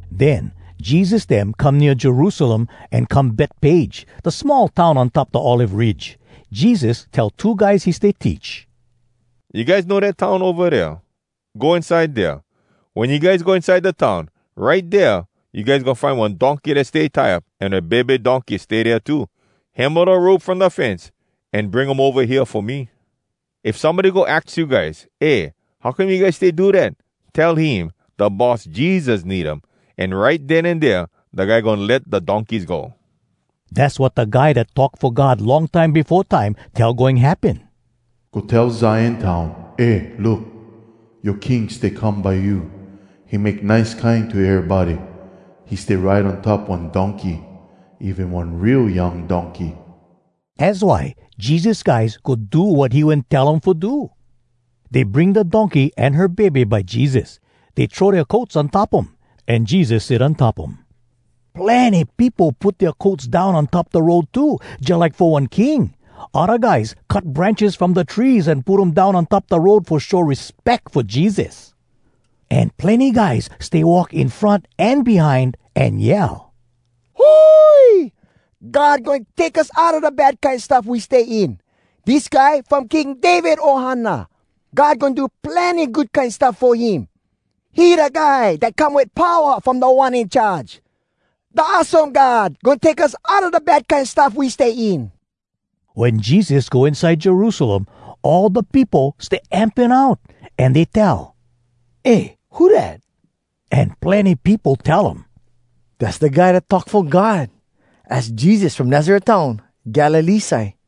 Den Jesus dem come nea Jerusalem an come Betpage, da small town on top da Olive Ridge. Jesus tell two guys he stay teach, “You guys know dat town ova dea? Go inside dea. Wen you guys go inside da town, right dea you guys goin find one donkey dat stay tie up, an her bebe donkey stay dea too. Hemo da rope from da fence, an bring um ova hea fo me. If somebody go aks you guys, ‘Eh, how come you guys stay do dat?’ tell him, ‘Da Boss Jesus need um.’ An right den an dea da guy goin let da donkeys go.” Dass wat da guy dat talk fo God long time befo time tell goin happen, “Go tell Zion town, Eh, look! Yoa King stay come by you, He make nice kine to erybody, He stay ride on top one donkey, Even one real young donkey.” Az why Jesus guys go do wat he wen tell um fo do. Dey bring da donkey an her bebe by Jesus. Dey throw dea coats on top um, an Jesus sit on top um. Plenny peopo put dea coats down on top da road too, jalike fo one king. Odda guys cut branches from da trees an put um down on top da road fo show respeck fo Jesus. An plenny guys stay walk in front an behind, an yell, “Hui! God goin take us outa da bad kine stuff we stay in! Dis guy from King David ohana, God goin do plenny good kine stuff fo him. He da guy dat come wit powa from Da One In Charge! Da awesome God goin take us Outa da bad kine stuff we stay in!” Wen Jesus go inside Jerusalem, all da peopo stay amping out, an dey tell, “Eh, who dat?” An plenny peopo tell um, “Dass da Guy dat talk fo God. Az Jesus from Nazaret town, Galilee side.”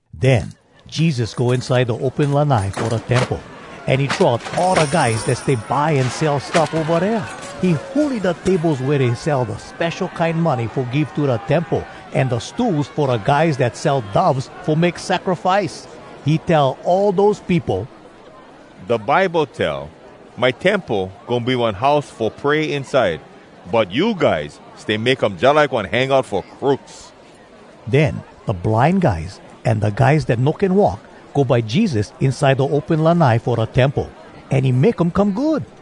Den Jesus go inside da open lanai fo da temple, an he throw out all da guys dat stay buy an sell stuff ova dea. He huli da tables wea dey sell da spesho kine money fo give to da temple, an da stools fo da guys dat sell doves fo make sacrifice. He tell all dose peopo, “Da Bible tell, ‘My temple goin be one house fo pray inside.’ But you guys stay make um jalike one hangout fo crooks!” Den da blind guys an da guys dat no can walk go by Jesus inside da open lanai fo da temple, an he make um come good.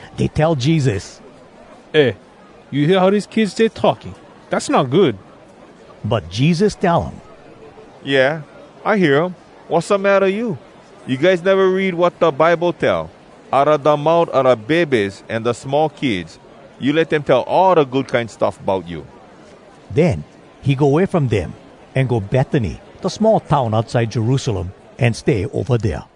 Dey tell Jesus, “Eh, you hear how dese kids stay talking? Dass not good!” But Jesus tell um, “Yeah, I hear um. Wassamatta you? You guys neva read wat da Bible tell? “‘Outa da mout a da bebes an da small kids, You let dem tell all da kine good stuff bout you.’” Den he go way from dem, an go Betany, da small town outside Jerusalem, an stay ova dea.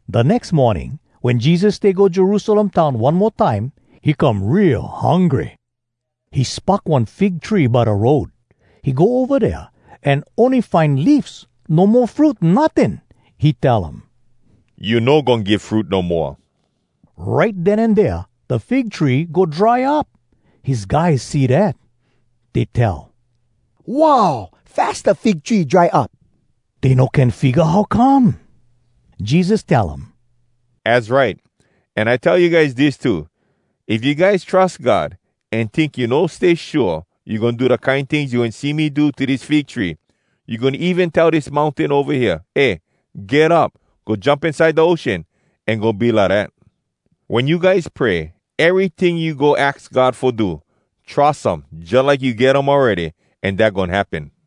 Da nex morning, wen Jesus stay go Jerusalem town one mo time, he come real hungry. He spock one fig tree by da road. He go ova dea, an ony find leafs, no mo fruit notting. He tell um, “You no goin give fruit no moa!” Right den an dea da fig tree go dry up. His guys see dat. Dey tell, “Wow! Fas da fig tree dry up!” Dey no can figga how come. Jesus tell um, “Az right! An I tell you guys dis too: If you guys trus God an tink you no stay shua, you goin do da kine tings you wen see me do to dis fig tree. You goin even tell dis mountain ova hea, ‘Eh, get up! Go jump inside da ocean,’ an goin be lidat. Wen you guys pray, eryting you go aks God fo do, trus um jalike you get um awready, an dat goin happen.”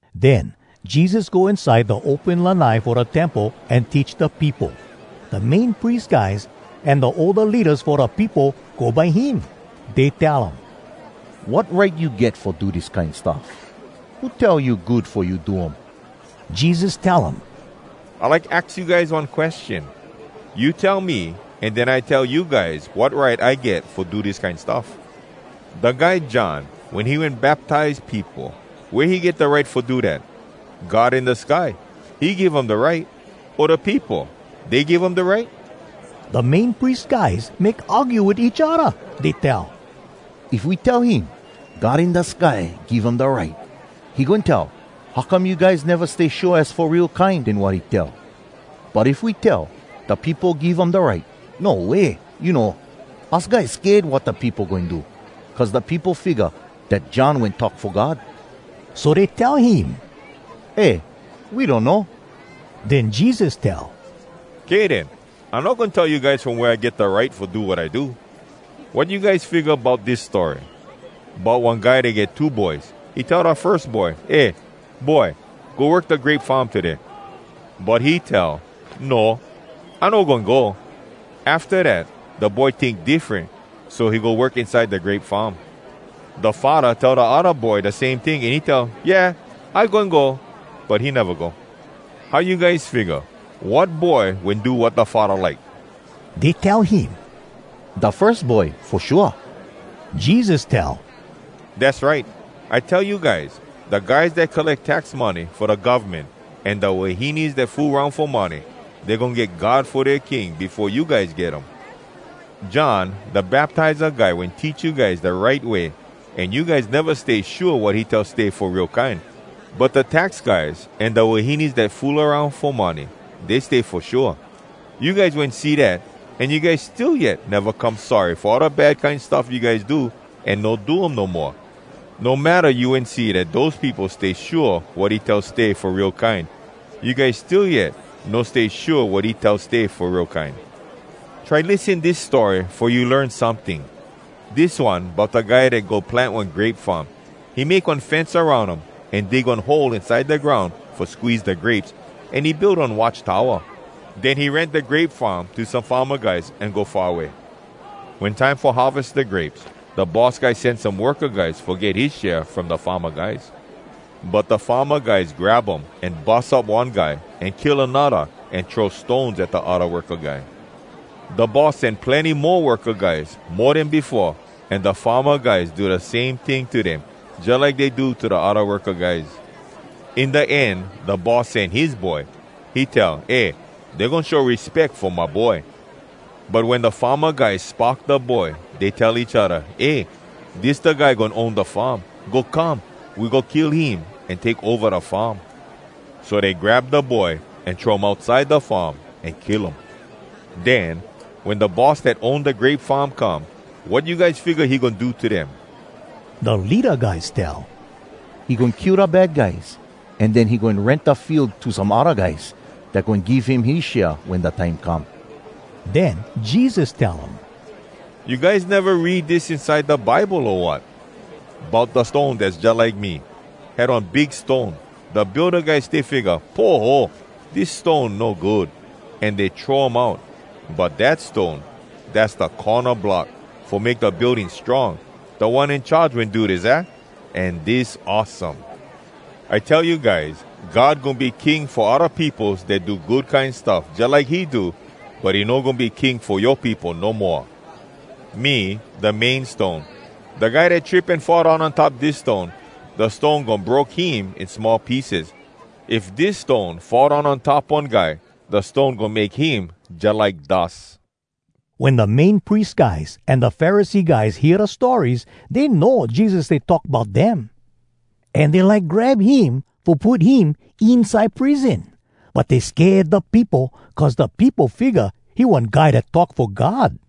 Den Jesus go inside da open lanai fo da temple, an teach da peopo. Da Main Pries guys an da older leadas fo da peopo go by him. Dey tell um, “Wat right you get fo do dis kine stuff? Who tell you good fo you do um?” Jesus tell um, “I like aks you guys one question. You tell me, an den I tell you guys wat right I get fo do dis kine stuff. Da guy John, wen he wen baptize peopo, wea he get da right fo do dat? God in da sky, he give um da right? O da peopo, dey give um da right?” Da Main Pries guys make argue wit each odda. Dey tell, “If we tell him, ‘God in da sky give um da right,’ he goin tell, ‘How come you guys neva stay shua az fo real kine den wat he tell?’ But if we tell, ‘Da peopo give um da right,’ no way! You know, us guys sked wat da peopo goin do, cuz da peopo figga dat John wen talk fo God.” So dey tell him, “Eh, we donno.” Den Jesus tell, “Kay den, I no goin tell you guys from wea I get da right fo do wat I do.” “Wat you guys figga bout dis story, bout one guy dat get two boys? He tell da firs boy, ‘Eh, boy, go work da grape farm today.’ “But he tell, ‘No. I no goin go.’ Afta dat da boy tink diffren, so he go work inside da grape farm. “Da faddah tell da odda boy da same ting, an he tell, ‘Yeah, I goin go.’ But he neva go. How you guys figga? Wat boy wen do wat da faddah like?” Dey tell him, “Da firs boy, fo shua.” Jesus tell, “Dass right! I tell you guys, da guys dat colleck tax money fo da govmen, an da wahines dat fool aroun fo money, dey goin get God fo dea king befo you guys get um. John Da Baptiza Guy wen teach you guys da right way, an you guys neva stay shua wat he tell stay fo real kine. But da tax guys an da wahines dat fool aroun fo money, dey stay fo shua. You guys wen see dat, an you guys still yet neva come sorry fo all da kine bad stuff you guys do an no do um no moa. No matta you wen see dat dose peopo stay shua wat he tell stay fo real kine, you guys still yet no stay shua wat he tell stay fo real kine.” “Try lissen dis story fo you learn someting. Dis one bout da guy dat go plant one grape farm. He make one fence aroun um, an dig one hole inside da groun fo squeeze da grapes, an he build one watch towa. Den he rent da grape farm to some farma guys an go far away. “Wen time fo harves da grapes, da boss guy sen some worka guys fo get his share from da farma guys. But da farma guys grab um, an bus up one guy, an kill anodda, an throw stones at da odda worka guy. Da boss sen plenny mo worka guys, mo den befo, an da farma guys do da same ting to dem, jalike dey do to da odda worka guys. “In da end da boss sen his boy. He tell, ‘Eh, dey goin show respeck fo my boy.’ “But wen da farma guys spock da boy, dey tell each odda, ‘Eh, dis da guy goin own da farm. Go come, we go kill him an take ova da farm.’ So dey grab da boy, an throw um outside da farm, an kill um. “Den, wen da boss dat own da grape farm come, wat you guys figga he goin do to dem?” Da leada guys tell, “He goin kill da bad guys, an den he goin rent da field to some odda guys, dat goin give him his share wen da time come.” Den Jesus tell um, “You guys neva read dis inside da Bible, o wat? bout da stone dass jalike me: “Had one big stone, Da builda guys stay figga, ‘Poho! Dis stone no good!’ An dey throw um out. But dat stone, Dass da corna block Fo make da building strong. Da One In Charge wen do dis, aah? An dis awesome!” “I tell you guys, God goin be king fo odda peopos dat do good kine stuff jalike he do. But he no goin be king fo yoa peopo no moa. [Me, da main stone. Da guy dat trip an fall down on top dis stone, da stone goin broke him in small pieces. If dis stone fall down on top one guy, da stone goin make him jalike dus.]” Wen da Main Pries guys an da Pharisee guys hear da stories, dey know Jesus stay talk bout dem. An dey like grab him fo put him inside prison. But dey sked da peopo, cuz da peopo figga he one guy dat talk fo God.